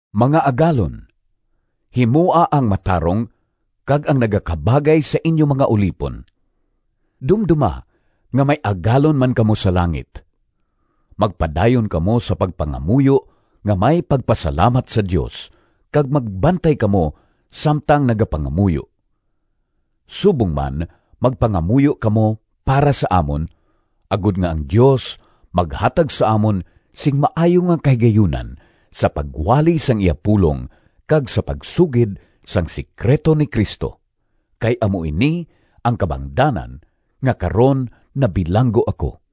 Mga agalon, himoa ang matarong kag ang nagakabagay sa inyo mga ulipon. Dumdoma nga may Agalon man kamo sa langit. Magpadayon kamo sa pagpangamuyo nga may pagpasalamat sa Dios, kag magbantay kamo samtang nagapangamuyo. Subong man magpangamuyo kamo para sa amon, agod nga ang Dios maghatag sa amon sing maayo nga kahigayunan sa pagwali sang iya pulong kag sa pagsugid sang sekrito ni Cristo. Kay amo ini ang kabangdanan nga karon nabilanggo ako.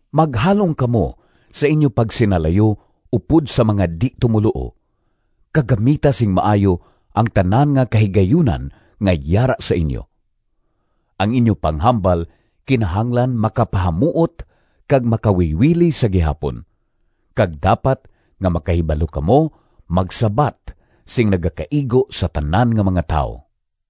Maghalong kamo sa inyo pagsinalayo upod sa mga di-tumoluo, kag gamita sing maayo ang tanan nga kahigayunan nga yara sa inyo. Ang inyo panghambal kinahanglan makapahamuot kag makawiwili sa gihapon, kag dapat nga makahibalo kamo magsabat sing nagakaigo sa tanan nga mga tawo.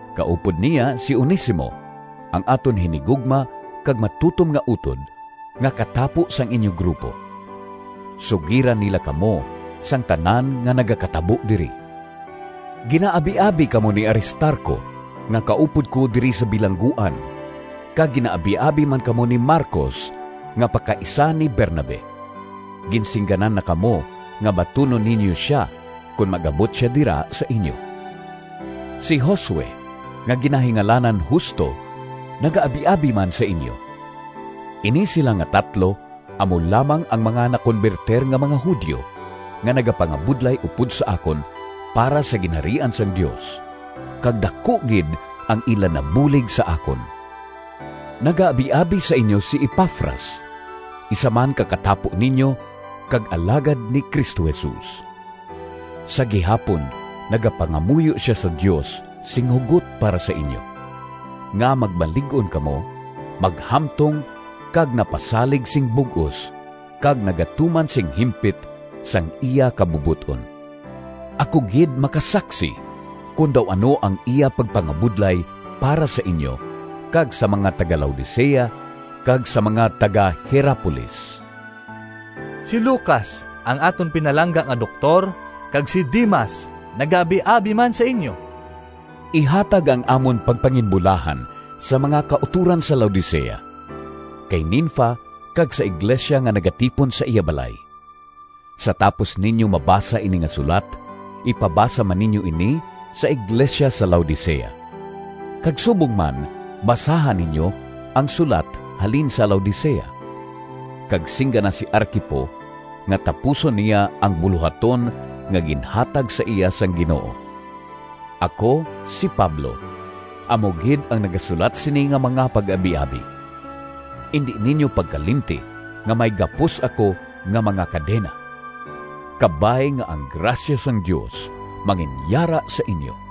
Kaupod niya si Onesimo, ang aton hinigugma kag matutom nga utod, nga katapo sang inyo grupo. Sugiran nila kamo sang tanan nga nagakatabo diri. Ginaabiabi kamo ni Aristarco nga kaupod ko diri sa bilangguan kag ginaabiabi man kamo ni Marcos nga pakaisa ni Bernabe. (Ginsingganan na kamo nga batunon ninyo sia kon mag-abot sia dira sa inyo.) Si Josue nga ginahingalanan Justo nagaabiabi man sa inyo. Ini sila nga tatlo amo lamang ang mga nakonbertir nga mga Judio nga nagapangabudlay upod sa akon para sa Ginharian sang Dios, kag daku gid ang ila nabulig sa akon. Nagaabiabi sa inyo si Epafras, isa man ka katapo ninyo kag alagad ni Cristo Jesus. Sa gihapon nagapangamuyo sia sa Dios sing hugot para sa inyo, nga magmalig-on kamo, maghamtong kag napasalig sing bug-os kag nagatuman sing himpit sang iya kabubot-on. Ako gid makasaksi kon daw ano ang iya pagpangabudlay para sa inyo kag sa mga taga-Laodicea kag sa mga taga-Hierapolis. Si Lucas, ang aton pinalangga nga doktor, kag si Demas nagaabiabi man sa inyo. Ihatag ang amon pagpanginbulahan sa mga kautoran sa Laodicea, kay Ninfa kag sa iglesia nga nagatipon sa iya balay. Sa tapos ninyo mabasa ini nga sulat, ipabasa man ninyo ini sa iglesia sa Laodicea. Kag subong man basaha ninyo ang sulat halin sa Laodicea. Kag singgana si Arquipo nga tapuson niya ang bulohaton nga ginhatag sa iya sang Ginoo. Ako, si Pablo, amo gid ang nagasulat sini nga mga pag-abiabi. Indi ninyo pagkalimti nga may gapos ako nga mga kadena! Kabay nga ang grasya sang Dios manginyara sa inyo.